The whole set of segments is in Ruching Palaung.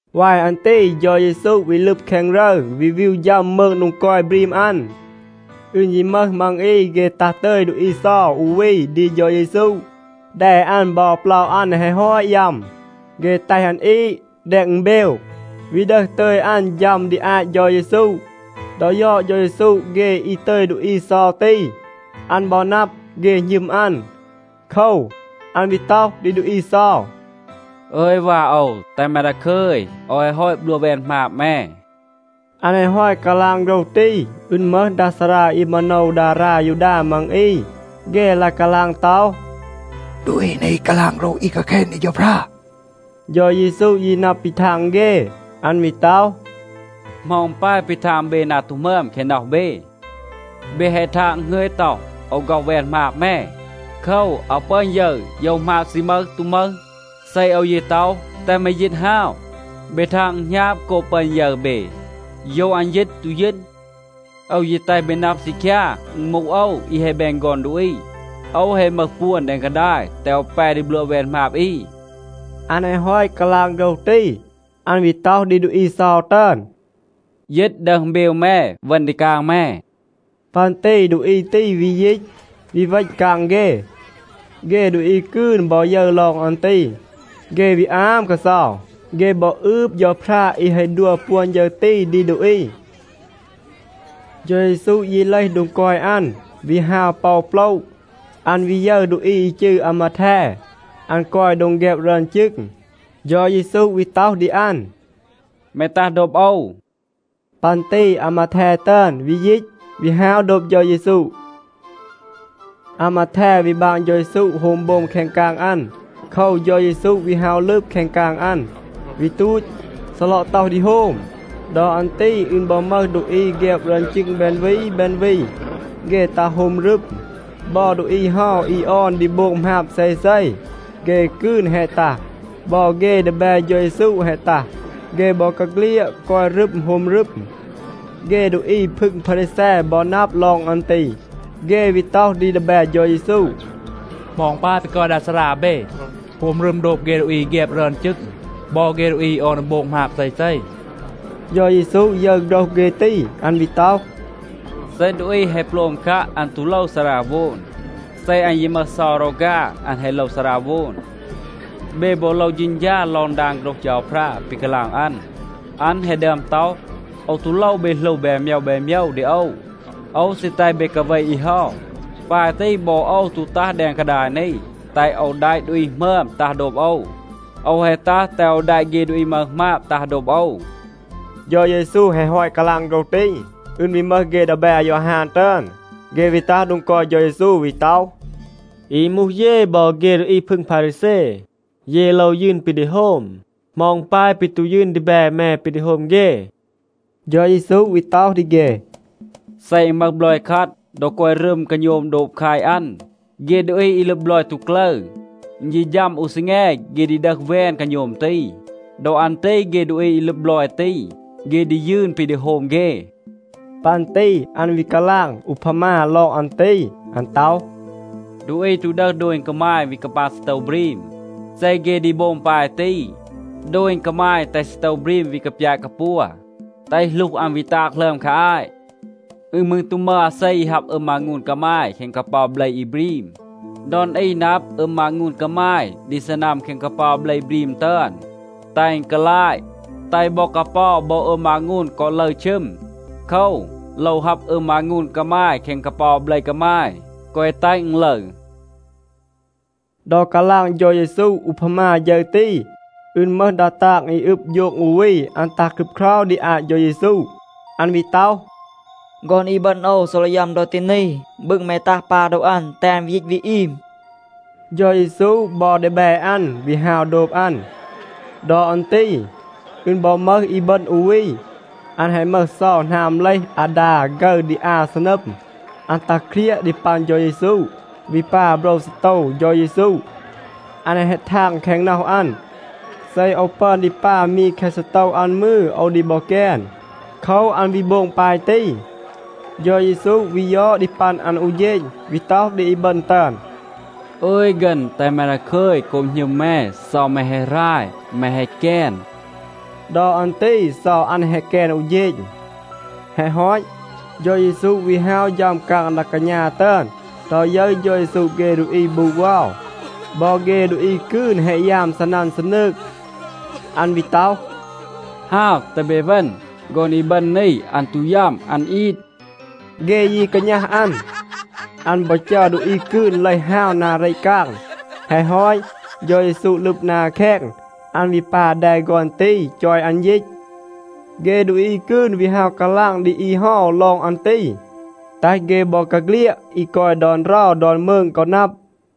วาย อัน ตี เฌา เยซู วี ลึบ แคง รึร, วี วีว ฌัม มืง โดง กอย บรีม อัน. อึณ ยี มึห มัง อี, เฆ ตัห ตึย ดูอี เซา อู วี ดี เฌา เยซู. แด อัน บอ เปลา อัน แฮะ ฮอต ยัม. เฆ แตห อัน อีด แดง อึณเบว, วี ดึห ตึย อัน ฌัม ดี อาต เฌา เยซู. ดอ ยอด เฌา เยซู เฆ อี ตึย ดูอี เซา ตี, อัน บอ นับ, เฆ หณึม อัน. โคว, อัน วี ต็อห ดี ดูอี เซา, “อึย วา โอว, แตห แม ดาคึย, โอว แฮะ ฮอต บลัวะ แวน หมาบ แม.” อัน แฮะ ฮอต กาลาง โฆรห ตี, อึณ มึห ดา ซารา อี มาโนว ดารา ยูดา มัง อี, เฆ ลาย กาลาง ต็อห, “ดูอี นี กาลาง โฆรห อี กาแคณ ดี เฌาพรา.” เฌา เยซู ยี นับ ปี ทาง เฆ. อัน วี ต็อห, “เหมา อึณ ปาย ปี ทาง เบ นา ตู หมึอม แคง น็อห เบ? เบ แฮะ ทาง, อึณ หงึย ต็อห, ‘โอว ฆ็อห แวน หมาบ แม.’ โคว, อาว ปึอน ยึร, โยว หมาบ ซี มึห, ตู มึห. เซ โอว ยี ต็อห, ‘แตห แม ยีต ฮาว,’ เบ ทาง อึณ หณาบ โกบ ปึอน ยึร เบ, โยว อัน ยีต, ตู ยีต. โอว ยี แตห เบ นับ ซีคยา, อึณ มูห โอว, อี แฮะ แบน ฆอน ดูอี, โอว แฮะ มึห ปวน แดง กาดาย แตห โอว แป ดี บลัวะ แวน หมาบ อี.” อัน แฮะ ฮอต กาลาง โฆรห ตี, อัน วี ต็อห ดี ดูอี เซา ตึอน, “ยีต, ดึห อึณเบว แม, เวณ ดี กาง แม.” ปัน ตี ดูอี ตี วี ยีต, วี เวณ กาง เฆ. เฆ ดูอี กืน บอ ยึร ลอง อัน ตี, เฆ วี อาม กาเซา. เฆ บอ อืบ เฌาพรา อี แฮะ ดัว ปวน ฌึร ตี ดี ดูอี. เฌา เยซู ยี เลห โดง กอย อัน, วี ฮาว ปอ โปละ. อัน วี ยึร ดูอี อี จืร อามาแท. อัน กอย โดง แฆบ รึอน จึง. เฌา เยซู วี ต็อห ดี อัน, “แม ตัห โดบ โอว.” ปัน ตี อามาแท ตึอน วี ยีต, วี ฮาว โดบ เฌา เยซู. อามาแท วี บาง เฌา เยซู โฮม โบม แคง กาง อัน. โคว, เฌา เยซู วี ฮาว ลึบ แคง กาง อัน, วี ตูต, ซีลอะ ต็อห ดี โฮม. ดอ อัน ตี อึณ บอ มึห ดูอี แฆบ รึอน จึง แบน วี แบน วี, เฆ ตัห โฮม รึม. บอ ดูอี เฮา อี ออน ดี โบง หมาบ เซเซ, เฆ กืน แฮะ ตัห. บอ เฆ ดีแบ เฌา เยซู แฮะ ตัห. เฆ บอกาเฆลียด กอย รึม โฮม รึม. เฆ ดูอี พึง พารีแซ บอ นับ ลอง อัน ตี, เฆ วี ต็อห ดี ดีแบ เฌา เยซู, “เหมา อึณ ปาย ปี กอย ดา ซารา เบ, โฮม รึม โดบ เฆ ดูอี อี แฆบ รึอน จึง บอ เฆ ดูอี อี ออน ดี โบง หมาบ เซเซ?” เฌา เยซู ยึร โฆรห เฆ ตี. อัน วี ต็อห, “เซ ดูอี แฮะ โปลม คัะ, อัน ตู โลว ซาราโวน. เซ อัน ยี มึห เซา รอฆา, อัน แฮะ โลว ซาราโวน. เบ บอ โลว เฌณฌา ลอง ดาง โฆรห เฌาพรา ปี กาลาง อัน. อัน แฮะ ดึอม ต็อห, ‘โอว ตู โลว เบ หลู แบน โมยว แบน โมยว ดี โอว. โอว ซี แตห เบ กาเว อี เฮา.’ ปาย ตี, บอ โอว ตู ตัห แดง กาดาย นี, แตห โอว แดะ ดูอี หมึอม ตัห โดบ โอว. โอว แฮะ ตัห, แตห โอว แดะ เฆ ดูอี มึห หมาบ ตัห โดบ โอว.” เฌา เยซู แฮะ ฮอต กาลาง โฆรห ตี, อึณ วี มึห เฆ ดีแบ อายอฮาน ตึอน, เฆ วี ตัห โดง กอย เฌา เยซู วี ต็อห, “อี มูห เย บอ เฆ ดูอี พึง พารีแซ, เย โลว ยืน ปี ดี โฮม. เหมา อึณ ปาย ปี ตู ยืน ดีแบ แม ปี ดี โฮม เฆ?” เฌา เยซู วี ต็อห ดี เฆ, “เซ อึณ มึห บลอย คัด, ดอ กอย รึม กาโณม โดบ แคต อัน, เฆ ดูอี อี ลึบ บลอย ตู กลึร. อึณ ยี ฌัม อู ซีแง, เฆ ดี ดึห แวน กาโณม ตี. ดอ อัน ตี เฆ ดูอี อี ลึบ บลอย ตี, เฆ ดี ยืน ปี ดี โฮม เฆ.” ปัน ตี อัน วี กาลาง อูพามา ลอง อัน ตี. อัน ต็อห, “ดูอี ตู ดึห โดณ กามาย วี กาปาง ซีโตว บรีม. เซ เฆ ดี โบง ปาย ตี, โดณ กามาย แตห ซีโตว บรีม วี กาปยาต กาปัว, แตห หลูห อัน วี ตาง หลึอม คา อาต. อึณ มืร ตู มึห อาเซ อี ฮับ อึม มางูน กามาย แคง กาเปา เบล อี บรีม.a ดอน อี นับ, อึม มางูน กามาย ดี ซีนัม แคง กาเปา เบล บรีม ตึอน, แตห อึณ กาลาต, แตห บอ กาเปา บอ อึม มางูน กอ ลึร ชึม. โคว, โลว ฮับ อึม มางูน กามาย แคง กาเปา เบล กามาย, แกวะ แตห อึณ ลึร.” ดอ กาลาง เฌา เยซู อูพามา ฌึร ตี, อึณ มึห ดา ตาง อี อึบ โฌง อู วี, อัน ตัห ครึบเครา ดี อาต เฌา เยซู. อัน วี ต็อห, “ฆอน อีบึณ โอว ซีลอะ ยัม ดอ ตี นี. บึง แม ตัห, ปา โดว อัน, แตห อัน วี ยีต วี อีม.” เฌา เยซู บอ ดีแบ อัน วี ฮาว โดบ อัน. ดอ อัน ตี อึณ บอ มึห อีบึณ อู วี. อัน แฮะ มึห เซา หนาม เลห อาดา ฆึร ดี อา ซีนัม. อัน ตัห เครียะ ดี ปัน เฌา เยซู, วี ปา โบรว ซีโตว เฌา เยซู. อัน แฮะ ทาง แคง น็อห อัน, “เซ โอว ปึอน ดี ปา มี แคะ ซีโตว อัน มืร, โอว ดี บอ แกน.” โคว, อัน วี โบง ปาย ตี. เฌา เยซู วี ยอด ดี ปัน อัน อู เฌณ, วี ต็อห ดี อีบึณ ตึอน, “อึย ฆึณ, แตห แม ดาคึย. โกบ หณึม แม, เซา แม แฮะ หราย, แม แฮะ แกน.” ดอ อัน ตี เซา อัน แฮะ แกน อู เฌณ. แฮะ ฮอต, เฌา เยซู วี ฮาว ฌัม กาง ดา กาณา ตึอน. ดอ ยึร เฌา เยซู เฆ ดูอี บูด เวา, บอ เฆ ดูอี กืน แฮะ ยาม ซีนัน ซีนืง, อัน วี ต็อห, “ฮาว, แตห เบ เวณ. ฆอน อีบึณ นี, อัน ตู ยัม. อัน อีด.” เฆ ยี กาณัห อัน. อัน บอ จัร ดูอี กืน เลห ฮาว นา เรต กาง. แฮะ ฮอต, เฌา เยซู ลึบ นา แคง. อัน วี ปา แด ฆอน ตี, จอย อัน ยีต. เฆ ดูอี กืน วี ฮาว กาลาง ดี อี เฮา ลอง อัน ตี, แตห เฆ บอกาเฆลียด อี กอย ดอน เรา ดอน มืง กอ นับ.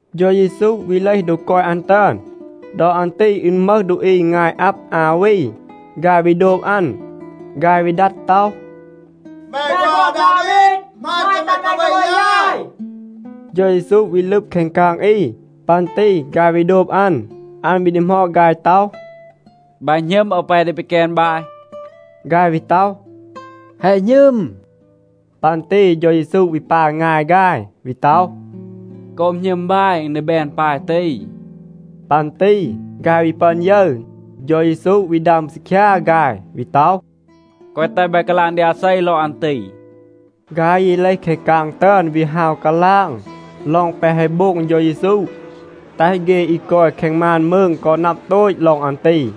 เฌา เยซู วี เลห โดง กอย อัน ตึอน. ดอ อัน ตี อึณ มึห ดูอี งาย อับ อา วี, ฆาย วี โดบ อัน. ฆาย วี ดัด ต็อห, “แม ฆอน อาดาวีด, หมาณ, แตห แม กาเว ยาย.” เฌา เยซู วี ลึบ แคง กาง อี. ปัน ตี ฆาย วี โดบ อัน. อัน วี ดีหมอด ฆาย ต็อห, “บาย หณึม, โอว แป ดี ปีแกน บาย?” ฆาย วี ต็อห, “แฮะ หณึม.” ปัน ตี เฌา เยซู วี ปา งาย ฆาย, วี ต็อห, “โกบ หณึม บาย, อึณ ดี แบน ปาย ตี.” ปัน ตี ฆาย วี ปึอน ยึร. เฌา เยซู วี ดัม ซีคยา ฆาย, วี ต็อห, “แกวะ แตห บาย กาลาง ดี อาเซ ลอง อัน ตี.” ฆาย ยี เลห แคง กาง ตึอน, วี ฮาว กาลาง ลอง แปะ แฮะ โบง เฌา เยซู, แตห เฆ อี กอย แคง มาน มืง กอ นับ โตต ลอง อัน ตี.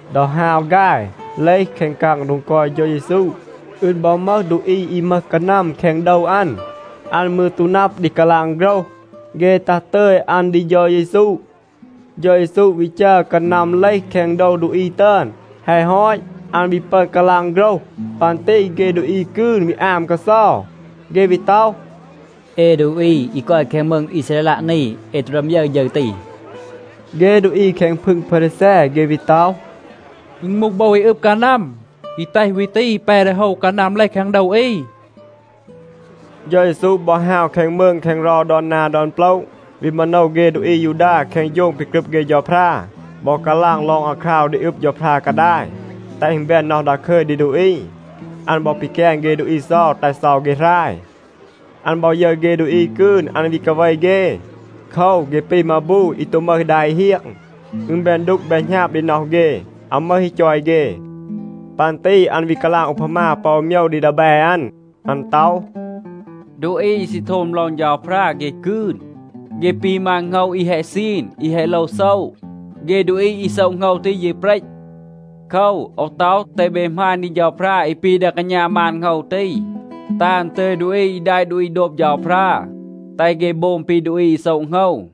ดอ ฮาว ฆาย เลห แคง กาง โดง กอย เฌา เยซู, อึณ บอ มึห ดูอี อี มึห กานัม แคง โดว อัน. อัน มืร ตู นับ ดี กาลาง โฆรห. เฆ ตัห ตึย อัน ดี เฌา เยซู. เฌา เยซู วี จัร กานัม เลห แคง โดว ดูอี ตึอน. แฮะ ฮอต, อัน วี ปึอน กาลาง โฆรห. ปัน ตี เฆ ดูอี กืน วี อาม กาเซา. เฆ วี ต็อห, “เอ ดูอี อี กอย แคง มืง อีซาเรลัะ นี, เอ ตู ดึอม ยึร ฌึร ตี.” เฆ ดูอี แคง พึง พารีแซ, เฆ วี ต็อห, “อึณ มูห โบว อี อึบ กานัม อี แตห วี ตี แป ดี โฮว กานัม เลห แคง โดว อี.” เฌา เยซู บอ ฮาว แคง มืง แคง เรา ดอน นา ดอน โปละ, วี มาโนว เฆ ดูอี อายูดา แคง โฌง ปี กรึบ เฆ เฌาพรา บอ กาลาง ลอง อาคราว ดี อึบ เฌาพรา กาดาย, แตห อึณ แบน น็อห ดาคึย ดี ดูอี. อัน บอ ปีแกน เฆ ดูอี เซา, แตห เซา เฆ หราย. อัน บอ ยึร เฆ ดูอี กืน, อัน วี กาเว เฆ. โคว, เฆ ปี มาบู อี ตู มึห ดา อี เฮียง. อึณ แบน ดูก แบน หณาบ ดี น็อห เฆ, อาว มึห อี จอย เฆ. ปัน ตี อัน วี กาลาง อูพามา ปอ อู โมยว ดี ดีแบ อัน. อัน ต็อห, “ดูอี อี ซี โทม ลอง เฌาพรา เฆ กืน. เฆ ปี มาน โหงว อี แฮะ ซีน, อี แฮะ โลว โซะ. เฆ ดูอี อี โซะ โหงว ตี ยี เปรต. โคว, โอว ต็อห, แตห เบ หมาณ ดี เฌาพรา อี ปี ดา กาณา มาน โหงว ตี, แตห อัน ตึย ดูอี อี แดะ ดูอี โดบ เฌาพรา, แตห เฆ โบง ปี ดูอี อี โซะ โหงว.”